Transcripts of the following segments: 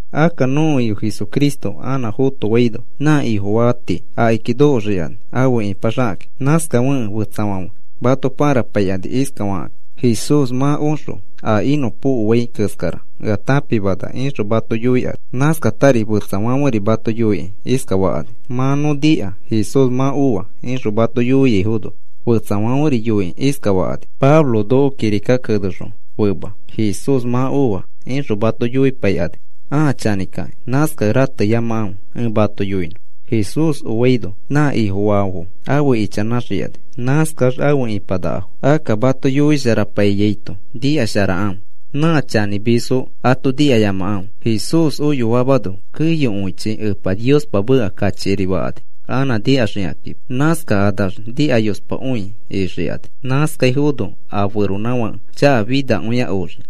Akka nõko Ifo Jesucristo anã fotofaino nã Ifofaafo tii akiki nokoxikani afe ipaxakakĩ. Nãskafekẽ fetsafãfe mato parapaikani iskafakakĩ: “Jesús mã oxõ a inõpokoaifo keskara ea tãpimana,” ixõ mato yoikani. Nãskatari fetsafãferi mato yoikĩ iskafakani: “Mã nõ nika Jesús mã oa,” ixõ mato yoiaifono, fetsafãferi yoikĩ iskafakani: “Pablo noko kirika kenexõ fema, ‘Jesús mã oa,’” ixõ mato yoipaikani, ãa chanĩkakĩ. Nãskakẽ rateyamakãfe. Ẽ mato yoinõ. Jesús oaino nã Ifofaafo afe ichanãxikani, nãskax afe ipanakafo. Akka mato yoisharapaiyaito nikasharakãfe. Nã chanĩmisfo ato nikayamakãfe. Jesús oyoamano keyokõichi Epa Niospa meka kachikiri fakani anã nikaxikakima. Nãskakanax nikayospakõi ixikani. Nãskaifono a feronãfake chakafinakõia oxii.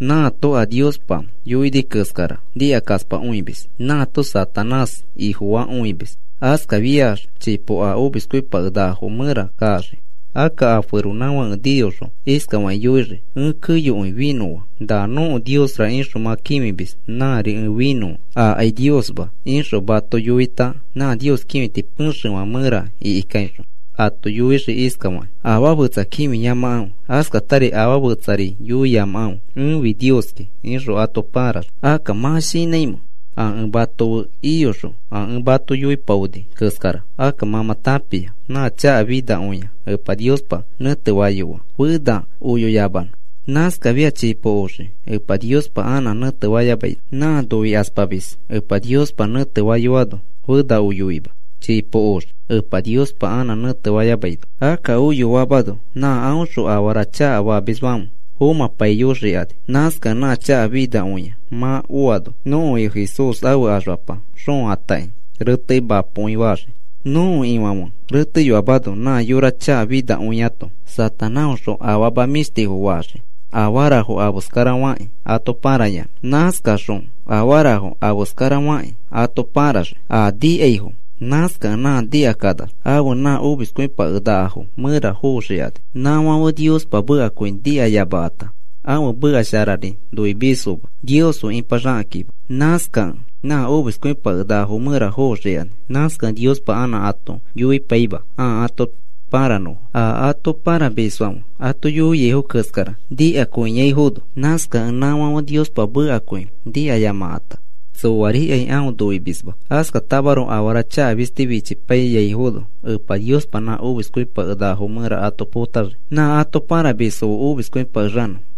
Nãato a Niospa yoini keskara nikakaspakõimis. Nãato Satanás ifofakõimis. Askafiax chipo a omiskõipakenakafo mẽra kaxii. Akka a feronãfãke niyoxõ iskafakĩ yoixii: “Ẽ keyokõi finõa. ‘Na nõko Niosra’ ixõ mã kĩfimis, nãri ẽ finõa. Akai Niosma,” ixõ ato yoita, nã Nios kĩfiti pexefã mẽra ikikaixõ ato yoixii iskafakĩ: “Afaa fetsa kĩfiyamakãfe. Askatari afaa fetsari noiyamakãfe. Ẽfi Nioski,” ixõ ato pãraxii. Akka, ¿mã shinãimamẽ a ẽ mato fe iyoxõ a ẽ mato yoipaoni keskara? Akka mã mã tãpia nã chaka finakõia Epa Niospa nẽtefayoa, fena oyoyamanõ. Nãskafiax chipo oxii Epa Niospa anã nẽtefayamaino. Nã noikaspamis Epa Niospa nẽtefayoano fena oyoima. Chipo oxii Epa Niospa anã nẽtefayamaino. Akka oyoamano nã aõxõ afara chakafamisfãfe fomãpaiyoxikani. Nãskakẽ nã chakafinakõia mã oano, nõko Ifo Jesús ãfe axfapa xoõ atakĩ retekĩ mapokõi fataxii. Nõko Ifãfe reteyoamano nã yora chakafinakõiato Satanáõxõ afama mĩshtifo faxii afarafo afeskarafakĩ ato parayanã. Nãskaxõ afarafo afeskarafakĩ ato pãraxii a nikaifo, nãskakẽ nã nikakanax afe nã omiskĩskõipakenakafo mẽra foxikani. Nãfãfe Niospa mekakõi nikayamakãta, ãfe meka sharari noimisfoma Nios fe ipaxakakĩma. Nãskakẽ nã omiskõipakenakafo mẽra foxikani. Nãskakẽ Niospa anã ato yoipaima ãa ato paranõfo, a ato paramisfãfe ato yoiaifo keskara nikakõiaifono. Nãskakẽ nãfãfe Niospa mekakõi nikayamakãta, tsoarikai aõ noimisma. Askatamaroko afara chaka fisti fichipaiyaifono Epa Niospa nã omiskõipakenakafo mẽra ato potaxii nã ato paramisfo fe omiskõipakexanõfo.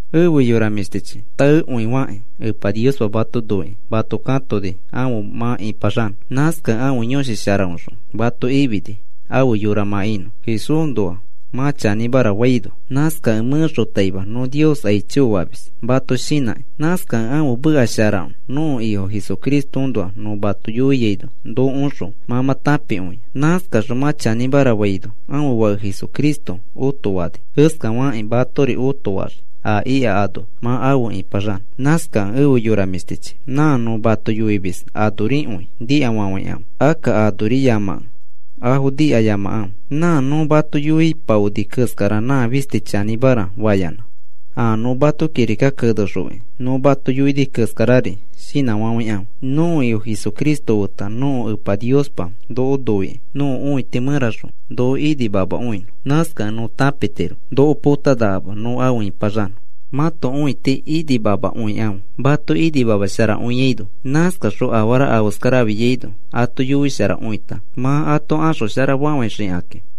Efe yora mĩshtichi, taekõifakĩ Epa Niospa mato noikĩ mato katoni afe mã ipaxanõ. Nãskakẽ ãfe Yõshi Sharaõxõ mato ifini afe yora mã inõ, Jesúsnoa mã chanĩmara faino. Nãskakẽ mẽxotaima nõ Nios aicho famis mato shinãkĩ. Nãskakẽ ãfe meka shara nõko Ifo Jesucristoõnoa nõ mato yoiaino nokoõxõ mã mã tãpikõia. Nãskaxõ mã chanĩmara faino ãfe Fake Jesucristo otofani keskafakĩ matori õtofaxii a ika ano mã afe ipaxanõ. Nãskakẽ efe yora mĩshtichi, nã nõ mato yoimis anorikõi nikafafãikãfe. Akka anoriyamakẽ afo nikayamakãfe. Nã nõ mato yoipaoni keskara nã fisti chanĩmara fayanã, a nõ mato kirika kenexoki nõ mato yoini keskarari shinãfafãikãfe. Nõko Ifo Jesucristo feta nõko Epa Niospa noko noikĩ, nõko õiti mẽraxõ noko inimamakõinõ. Nãskakẽ nõ tãpitiro noko potanakama nõ afe ipaxanõ. Mãto õiti inimamakõikãfe mato imasharakõiaino. Nãskaxõ afara afeskara afiaino ato yoisharakõita mã ato axosharafafãixikakĩ.